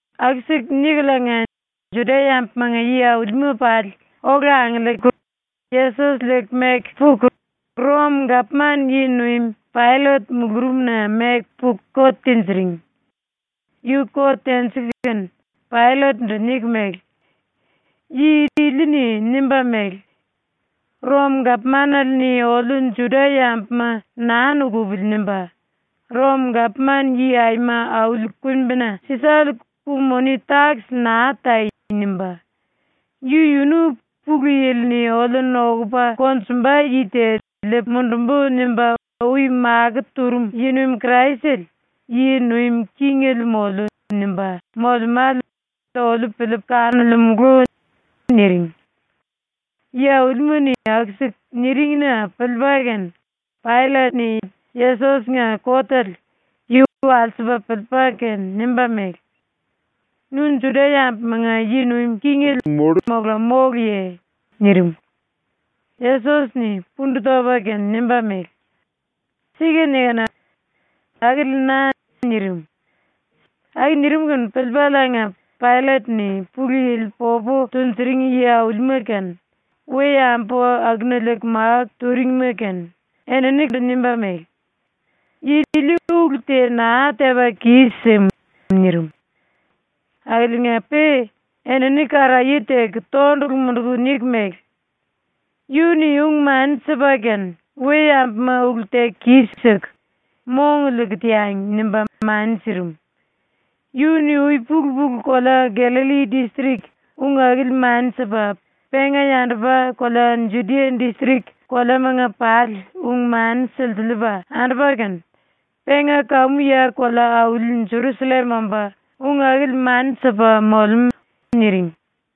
Aku-siku nikuliinga Juda-yambumanga yi-aulima pali ola angiliiku Yesos liiku meku puku ⸤Rom-gapman yi-nuim⸥ Paillet mulurumna meku puku kot tinjiring. Yu kot tenjiku kene Paillet-ndu niku mele: “Yi ili-ni nimba mele: “Rom-gapmanale-ni oliu Juda-yambuma naa nukupili.” nimba, “Rom-Gapman-Yi Aima Auli Kumbina Sisale ku-moni-takis naa tai.” nimba, “Yu-yunu “Pulu Yili-ni oliu nokupa konjumba yi te liipu mundumbu.” nimba ui makó turum yi-nuim Kraisele, yi nuim kingele moliu.” nimba molemále oliu piliipu kanolemulu.” niring. Yi-aulima-ni aku-siku niring-na piliipa kene Paillet-ni ⸤Yesos-nga kotele⸥ yu walsipa piliipa kene nimba mele: “Nu Juda-yambumanga yi nuim kingele mola móluye?” nirim. Yesos-ni pundu topa kene nimba mele: “Sika nikinu. Akili na.” nirim. Aku nirim kene piliipaliinga Paillet-ni Pulu Yili popu tunjuring yi-aulima kene, we-yambu akuna liiku máku turingima kene, eninindu nimba mele: “Yi ili ulu te naa tepa kis-sim.” nirim. Akiliinga-pe enini karaye teku tondulu munduku niku mele: “Yu-ni ung-mani sipa kene “We-yambuma ulu teku kis-siku, mong liiku teangi.” nimba mani sirim. Yu-ni ui-pulu-pulu kolea Gallalli distrik ung akili mani sipa, penga yandupa kolea Judia distrik koleamanga pali ung-mani silsiliipa andupa kene, penga kamu ya kolea-auli Jerusallem omba ung akili mani sipa molemú.” niring.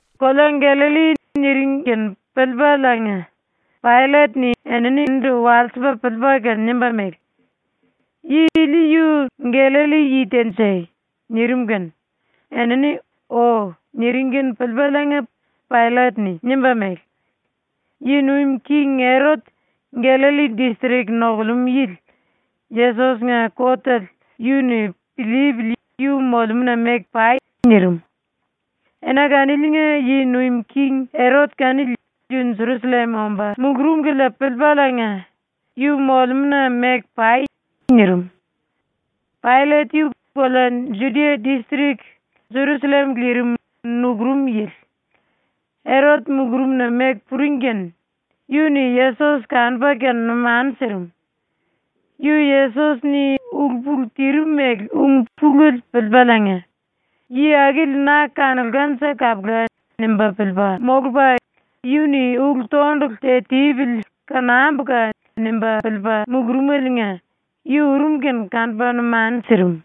“Kolea Gallalli” niring kene piliipaliinga Paillet-ni eninindu walsipa piliipa kene nimba mele: “Yi ili yu Gallalli-yi ténje?” nirim kene enini “O.” niring kene piliipaliinga Paillet-ni nimba mele: “⸤Yi nuim king⸥ Erot, Gallalli distrik nokulemú yili, Yesos-nga kotele yu-ni piliipili yu molemúna meku pai.” nirim. Ena kaniliinga ⸤yi nuim king⸥ Erot kanili yu Jerusallem omba mulurum kilia piliipaliinga, “Yu molemúna meku pai.” nirim. ⸤Paillet yu kolea Judia distrik, Jerusallem lirim, nukurum yili.⸥ Erot ⸤mulurumna meku puring kene⸥ yu-ni Yesos kanupa kene numanu sirim. Yu Yesos-ni ulu-pulu tirim mele ung pulele piliipaliinga, ‘Yi akili na kanulkanje kapula!’ nimba piliipa molupa, ‘Yu-ni ulu-tondulu te tipili kanambuka!’ nimba piliipa mulurumeliinga yu urum kene kanupa numanu sirim.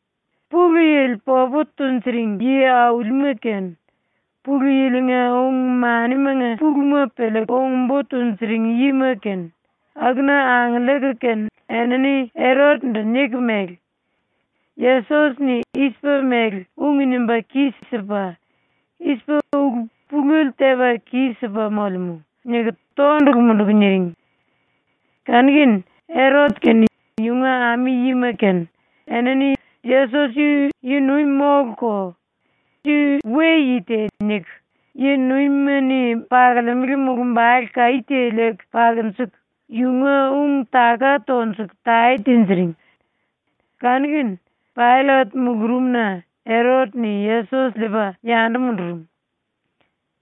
Pulu Yili popu tunjuring yi-aulima kene, Pulu Yili-nga ung-manimanga puluma piliiku ung-bo tunjuring yima kene, akuna angiliiku kene enini Erot-ndu niku mele: “Yesos-ni i-sipa mele ung nimba kis-sipa, i-sipa ulu pulele tepa kis-sipa molemú.” niku tondulu munduku niring. Kanu-kene Erot kene yunga ami-yima kene enini ‘Yesos yu yi-nuim móluko, yu we-yi te.’ niku yi-nuimima-ni pakolemele mulumbale kaí te liiku pakunjuku, yunga ung-taka tonjuku tae tinjiring. Kanu-kene Paillet mulurumna Erot-ni Yesos liipa yandu mundurum.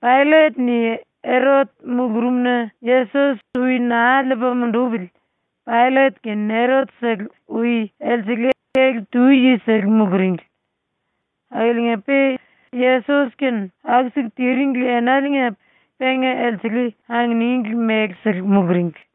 Paillet-ni Erot mulurumna Yesos ui naa liipa mundupili Paillet kene Erot-sele ui elsele ele-tu yisele muluringli. Akiliinga-pe Yesos-kene aku-siku tiringli enaliinga penga elsele anginingli mele-sele muluringli.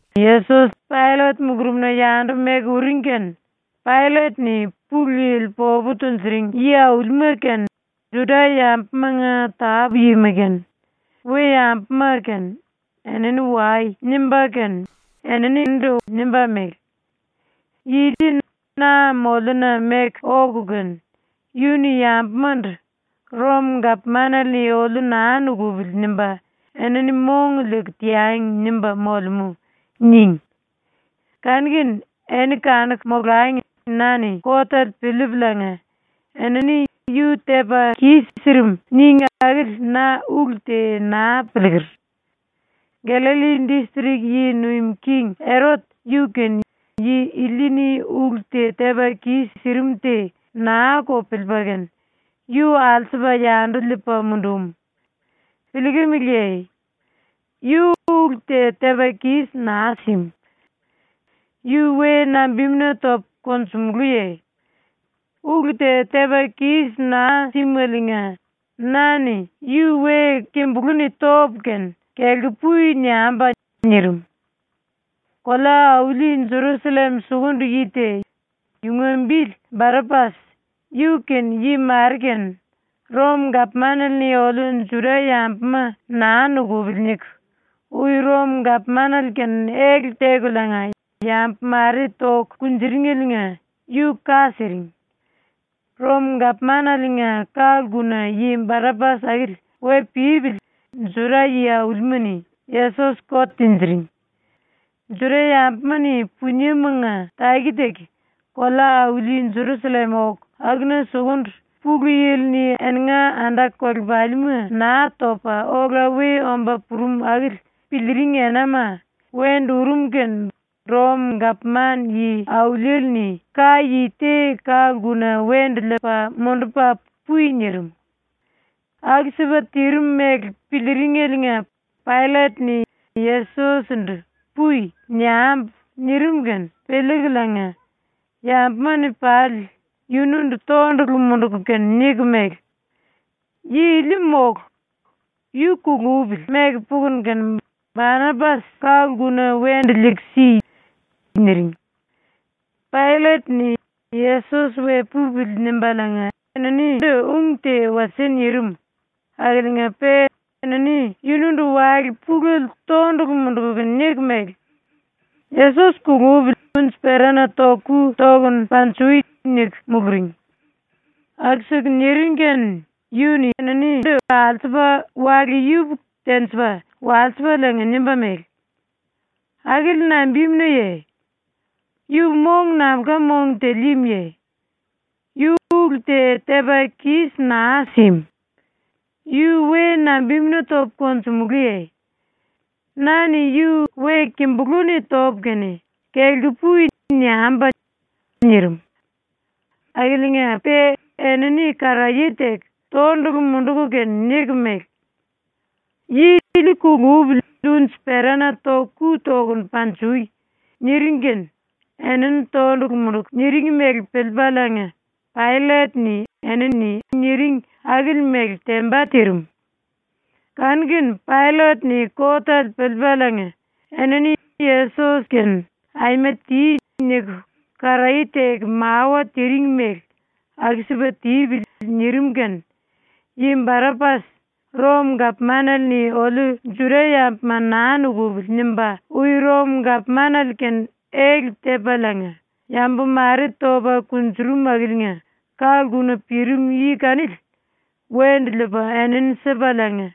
Yesos Paillet mulurumna yandu meku uring kene Paillet-ni Pulu Yili popu tunjuring yi-aulima kene, Juda-yambumanga tápu-yima kene, we-yambuma kene, “Enini wai.” nimba kene nimba mele: “Yi ili na moliuna meku oku kene “Yu-ni yambumandu ‘Rom-gapmanale-ni oliu naa nukupili.’ nimba ‘Enini mong liiku teangi.’ nimba molemú.” níngi. Kanu-kene eni kanuku molangi na-ni kotele piliipuliinga eni ‘Yu tepa kis-sirim.’ níngi akili na ulu te naa piliiker. ⸤Gallalli distrik yi nuim king⸥ Erot, yu-kene yi ili-ni ulu te tepa kis-sirim te naa-ko piliipa kene yu alsupa yandu liipa mundum. Piliikimiliye? Yu ulu te tepa kis naa sim. Yu we nambimuna topu konjumulúye? Ulu te tepa kis naa símaliinga na-ni yu we kimbulú-ni topu kene “Kelku pui.” niambu.” nirim. (Kolea-auli Jerusallem sukundu yi te, yunga bili Barapas, ⸤yu kene yi mare kene⸥ ‘Rom-gapmanale-ni oliu Juda-yambuma naa nukupili.’ niku ui Rom-gapmanale kene ele tekuliinga yambu mare toku kunjuringeliinga yu ka siring. ⸤Rom-gapmanaliinga ka-lkuna yi Barapas akili we pípili Juda yi-aulima-ni Yesos kot tinjiring⸥. Juda-yambuma-ni puniemanga taki-taki kolea-auli Jerusallem oku akuna sukundu Pulu Yili-ni eninga anda-kolepalima Naa Topa Ola We Omba Purum akili piliiring enama wendu urum kene Rom-gapman yi-auliele-ni ka-yi te ka-lkuna wendu liipa mundupa “Pui.” nirim.) ⸤Aku-sipa tirim mele piliiringeliinga Paillet-ni “Yesos-ndu “Pui.” niambu.” nirim kene piliikuliinga⸥ yambuma-ni pali yundu tondulu munduku kene niku mele: “Yi ili mólu. Yu ⸤kulupili⸥ meku pukunu kene, Barapas, ⸤ka-lkuna⸥ wendu liiku si.” niring. Paillet-ni ‘Yesos we pupili.’ nimbaliinga eninindu ung te wasie nirim akiliinga-pe enini yundu wale pulele tondulu munduku niku mele: “Yesos kulupili unji-perana ⸤toku⸥ ku tokunu panjui!” niku muluring. Aku-siku niring kene yu-ni eninindu alsupa wale yupuku-tenjipa walsipaliinga nimba mele: “Akili nambimunaye? Yu mong nambulka mong te líímuye? Yu ulu te tepa kis naa sim. Yu we nambimuna topu konjumulúye? Na-ni yu we kimbulú-ni topu kene “Kelku pui.” niambu.” nirim. Akiliinga-pe enini karaye teku tondulu munduku kene niku mele: “Yi ili kulupili unji-perana ⸤toku⸥ ku tokunu panjui!” niring kene enini tondulu munduku niring mele piliipaliinga Paillet-ni enini niring akili mele temba tirim. Kanu-kene Paillet-ni kotele piliipaliinga enini Yesos-kene “Aima ti.” niku karaye teku mawa tiring mele ‘Aku-sipa tipili.’ nirim kene ⸤yi Barapas,⸥ ‘Rom-gapmanale-ni oliu Juda-yambuma naa nukupili.’ nimba ui Rom-gapmanale kene ele tepaliinga yambu mare topa kunjurum akiliinga ka-lkuna pirim yi kanili, wendu liipa enini sipaliinga,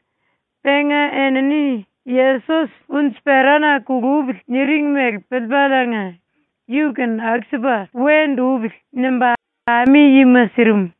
penga enini ‘Yesos unji-perana kulupili.’ niring mele piliipaliinga “Yu-kene aku-sipa wendu upili.” nimba ami-yima sirim.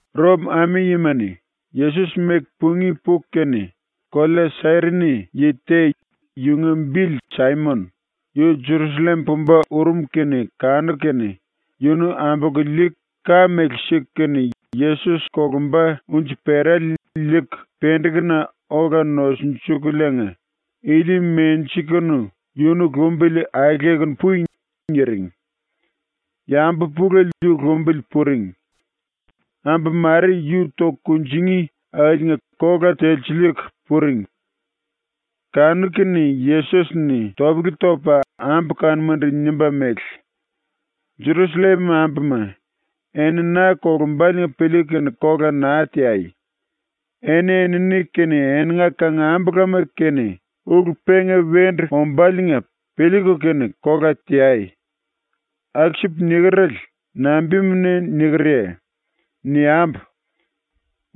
⸤Rom ami-yima-ni⸥ Yesos meku pungí puku kene, kolea Sairini yi te, yunga bili Saimon, yu Jerusallem pumba urum kene kanuku kene yunu ambolku liiku ka mele siku kene Yesos kolumba unji-perale liiku pendekuna ola nosunjukuliinga “Ili menjikunu yunu lumbili aelekunu pui.” niring. Yambu pulele yu lumbili puring. Ambu mare yu toku kunjingí akiliinga kola telsiliiku puring. Kanu-kene Yesos-ni topele topa ambu kanumandu nimba mele: “Jerusallem ambuma, eni na kolumbaliinga piliiku kene kola naa teai. Eni-enini kene eninga kangambulama kene ulu penga wendu ombáliinga piliiku kene kola teai. Aku-sipu nikerele, nambimuna nikerye? Niambu: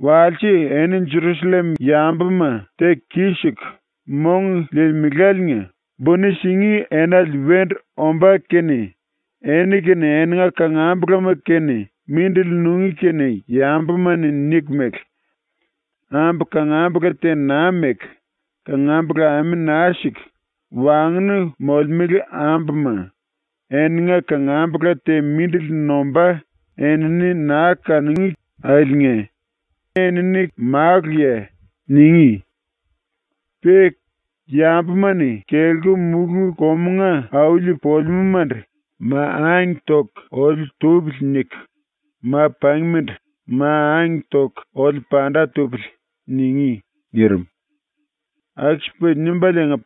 Walse eni Jerusallem yambuma ⸤teku kis-siku mong liilimeláliinga buni singí⸥ enale wendu ombá kene eni kene eninga kangambulama kene mindili nungí kene yambuma-ni niku mele: “Ambu kangambula te naa meku, kangambula ame naa siku, wangnu molemele ambuma, eninga kangambula te mindili nombá enini naa kanungí akiliinga enini maluya.” ningí. Pe ‘yambuma-ni kelku mulú-komunga auli polemúmandu “Ma angke toku oliu tupili.” niku, ma-pangímandu “Ma angke toku oliu panda tupili.” ningí.’” ⸤nirim.⸥ ⸤Aku-sipa nimbaliinga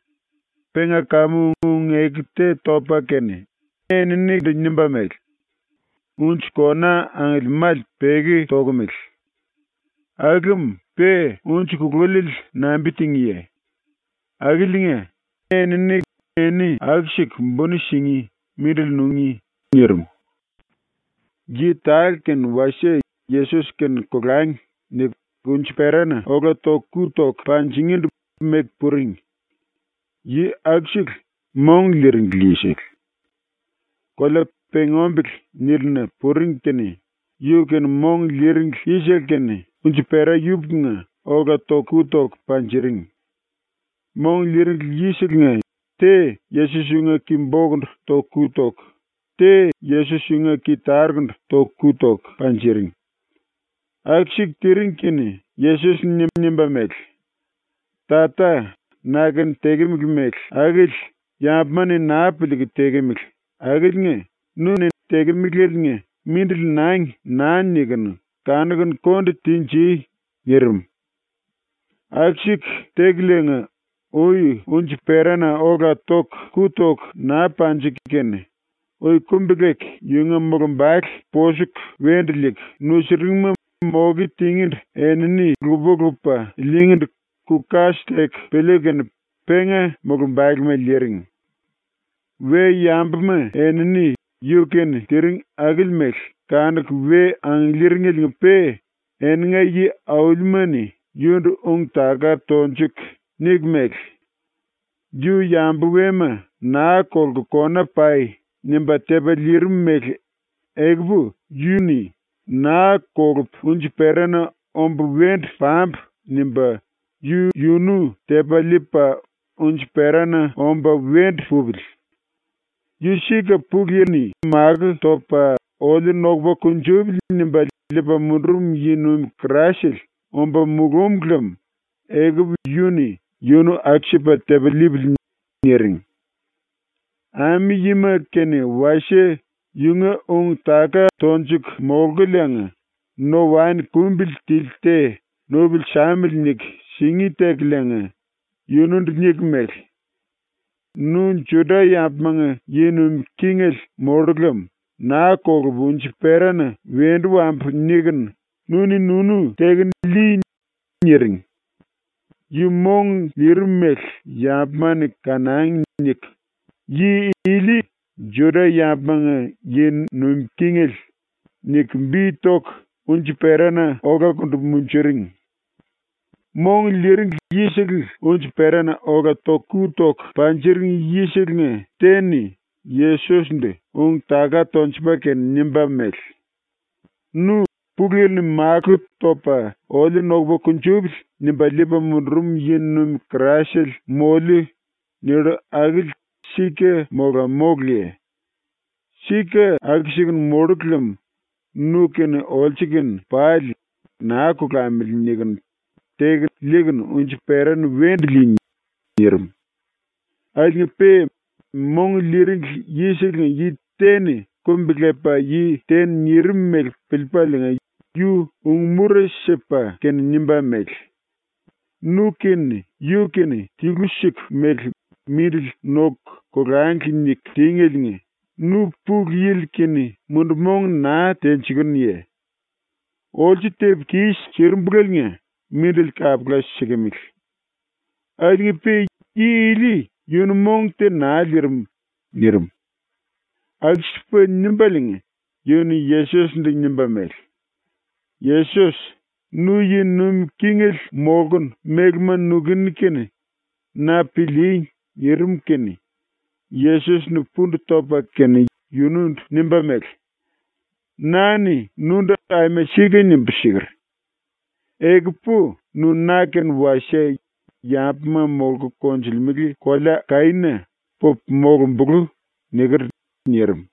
penga kamu ung-eku te topa kene eninindu nimba mele:⸥ “Unji kona angiliimále peki tokomele. Aku lem pe unji kululiele nambi tingíye? Akiliinga ⸤enini eni aku-siku buni singí, mindili nungí⸥.” nirim. Yi tale kene wasie ‘Yesos kene kolangi.’ niku unji-perana ola ⸤toku⸥ ku toku panjingíndu meku puring. Yi akusele mong liiringli yisele. Kolea ‘Pengí Ombele’ nílina puring kene yu kene mong liiringli yisele kene unji-pera yupukunga ola ⸤toku⸥ ku toku panjiring. Mong liiringli yiselenga te Yesos yunga ki-bokundu ⸤toku⸥ ku toku, te Yesos yunga ki-tarukundu ⸤toku⸥ ku toku panjiring. Aku-siku tiring kene Yesos-ni nimba mele: “Tata, na-kene tekemele mele akili yambuma-ni naa piliiku tekemele akiliinga nu-ni tekemelaliinga “Mindili nangi.” naa nikunu kanokunu konde tenji.” nirim. ⸤Aku-siku tekuliinga, ui unji-perana ola ⸤toku⸥ ku toku naa panjiku kene⸥ ui kumbi-leku yunga mulumbale ⸤posuku wendu liiku nusuringma⸥ moke tingíndu enini lupa-lupa liingíndu ku-kas teku piliiku kene penga mulumbalema liiring. We-yambuma enini yu-kene tiring akili mele kanuku we angiliiringeliinga-pe eninga yi-aulima-ni yundu ung-taka tonjuku niku mele: “Yu yambu wema ‘Naa kolku kona pai.’ nimba tepa liirim mele ekupu yu-ni ‘Naa kolupu unji-perana omba wendu pambu.’ nimba yu-yunu tepa liipa unji-perana omba wendu pupili. Yu sika Pulu Yili-ni makó topa oliu ‘Nokupa kunjupili.’ nimba liipa mundurum yi nuim Kraisele omba mulúm lem ekupu yu-ni yunu aku-sipa tepa liipili.” niring. Ami-yima kene wasie yunga ung-taka tonjuku molkuliinga no-waen kumbili tili te ‘Nupili samili.’ niku singí tekuliinga yunundu niku mele: “Nu Juda-yambumanga yi nuim kingele mollu lem ‘Naa kolupu unji-perana wendu wambu.’ nikunu nu-ni nunu tekunu lii.” niring. ‘Yu mong liirim mele yambuma-ni kanangi.’ niku YI ILI JUDA-YAMBUMANGA YI NUIM KINGELE niku bi toku unji-perana olakundu munjuring. Mong liiringli yisele unji-perana ola ⸤toku⸥ ku toku panjiring yiselenga te-ni Yesos-ndu ung-taka tonjupa kene nimba mele: “Nu “Pulu Yili-ni makó topa oliu ‘Nokupa kunjupili.’ nimba liipa mundurum yi-nuim Kraisele ⸤moliu.” nillu akili sika mola móluye? Sika aku-sikunu⸥ mollu lem nu kene olsu kene pali ‘Naa kolamili.’ nikunu teku liikunu unji-perana wendu lii.” nirim. Akiliinga-pe mong liiringli yiselenga yi te-ni kumbi-lepa yi te-ni nirim mele piliipaliinga yu ung-mura sipa kene nimba mele: “Nu kene yu kene tilu-siku mele mindili noku kolangli niku tíngeliinga nu Pulu Yili-kene mundu-mong naa tenjikunuye? Olsu tepu kis-sirimbulaliinga mindili kapula sikimili. Akiliinga-pe yi ili yunu mong te naa liirim.” nirim. Aku-sipa nimbaliinga yu-ni ⸤Yesos-ndu⸥ nimba mele: “Yesos, nu yi nuim kingele molkunu mélema nukuni kene na pilíí.” nirim kene Yesos-ni pundu topa kene yundu nimba mele: “Na-ni nundu aima sika nimbu siker: “Ekupu nu na-kene wasie Yambuma Molku Konjulemele Kolea Kaína pupu molumbulú.” niker.” nirim.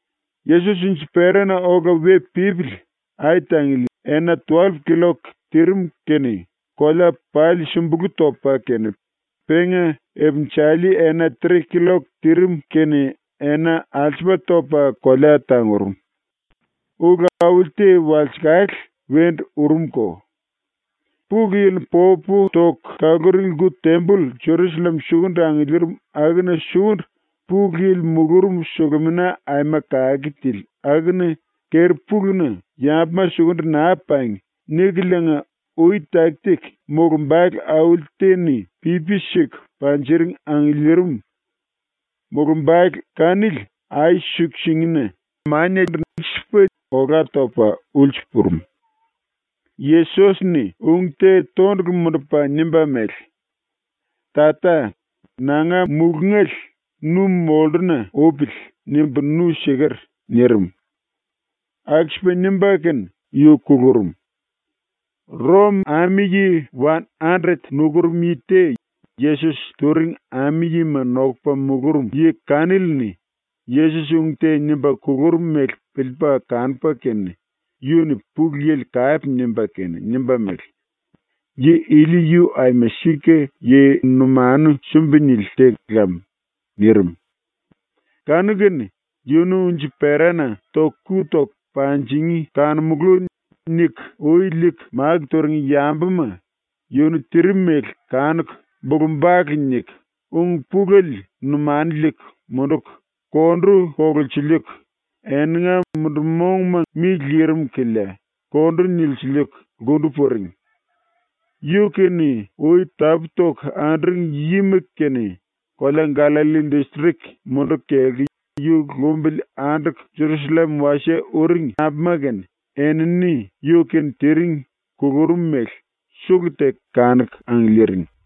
Yesos unji-perana ola we pípili ai-tangili ena tuwallup killok tirim kene kolea pali sumbulú topa kene penga ipinjali ena tre killok tirim kene ena alsupa topa kolea tangurum. ⸤Ulu auli te walsekale wendu urumko. Pulu Yili popu toku kaluring⸥ lku-temboll ⸤Jerusallem sukundu angiliirim akuna sukundu Pulu Yili mulurum⸥ Sulumina Aima Kake Tili akuna keri-puluna ⸤‘Yambuma sukundu naa pangi.’ nikuliinga ui taki-taki⸥ mulumbale auli te-ni pipi siku panjiring angiliirim. Mulumbale kanili ai-suku-singina olá topa ulsu purum. Yesos-ni ung te tondulu mundupa nimba mele: “Tata, nanga mulungale ‘Nu molluna upili.’ nimbu nu siker.” nirim. Aku-sipa nimba kene yu kulurum. ⸤Rom⸥ ami-yi wan-andret nukurum yi te Yesos turing ami-yima nokupa mulurum yi kanili-ni Yesos ung te nimba kulurum mele piliipa kanupa kene yu-ni Pulu Yili kape nimba kene nimba mele: “Yi ili yu aima sika yi numanu sumbi-nili te lam.” nirim. Kanu-kene ‘Yunu unji-perana ⸤toku⸥ ku toku panjingí kanomulú.’ niku ui liiku máku turing yambuma yunu tirim mele kanuku bulu-bale niku ung pulele numanu liiku munduku kondu kolulsiliiku eninga mundu-mongma mi lirim kilia kondu nilsiliiku lkundu puring. Yu-kene ui tapú-toku anduring yima kene, kolea Gallalli distrik munduku kelku yu lumbili anduku ⸤Jerusallem⸥ wasie uring ambuma kene enini ⸤yu-kene tiring kulurum mele⸥ sulu-teku kanuku angiliiring.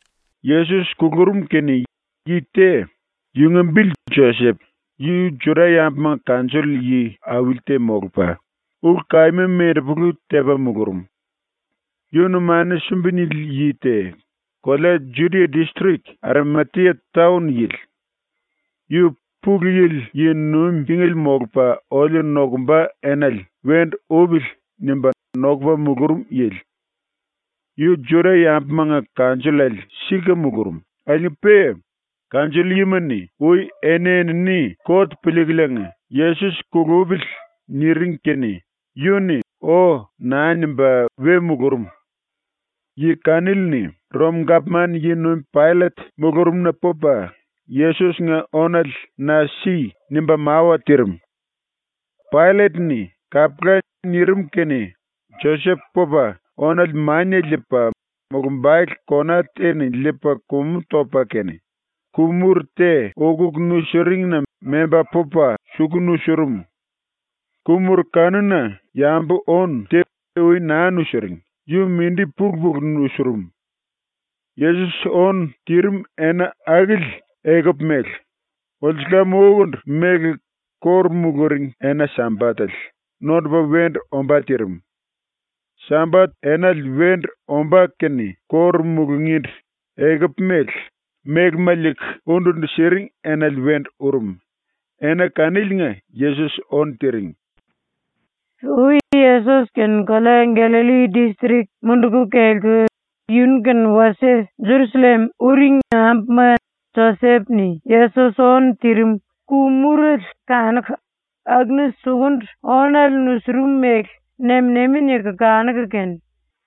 Yesos kulurum kene yi te, yunga bili Josep, yu Juda-yambumanga kanjoll yi-auli te molupa, ulu-kaíma mendepulu tepa mulurum. Yu numanu sumbi-nili yi te, kolea Judia distrik Arimatia taon yili. Yu ‘Pulu Yili yi nuim kingele molupa oliu nokumba enale wendu upili.’ nimba nokupa mulurum yili. Yu Juda-yambumanga kanjollale sika mulurum, akiliinga-pe kanjoll-yima-ni ⸤ui eni-enini kot piliikuliinga⸥ “Yesos kulupili.” niring kene yu-ni “O.” naa nimba we mulurum. Yi kanili-ni ⸤Rom-gapman yi-nuim⸥ Paillet mulurumna pupa, “Yesos-nga ónale na si.” nimba mawa tirim. Paillet-ni “Kapula.” nirim kene Josep pupa ónale mania liipa, mulumbale kona te-ni liipa kumu topa kene, ku-muru te ukuku nusiringina memba pupa suku nusurum. Ku-muru kanuna yambu-ónu te ui naa nusiring, yu mindi pulu-pulu nusurum. Yesos ónu tirim ena akili ekupu mele, ulsulam-ukundu mele ⸤kóru muluring⸥ ena Sambatele nondupa wendu ombá tirim. Sambat enale wendu ombá kene kóru mulungíndu ekupu mele, mélema liiku undu-undu siring enale wendu urum, ena kaniliinga Yesos ónu tiring. Ui Yesos kene kolea Gallalli distrik munduku kelku yunu kene wasie ⸤Jerusallem⸥ uring ambuma Josep-ni Yesos ónu tirim ku-murele kanuku akuna sukundu ónale nusurum mele nem-nemi niku kanuku kene,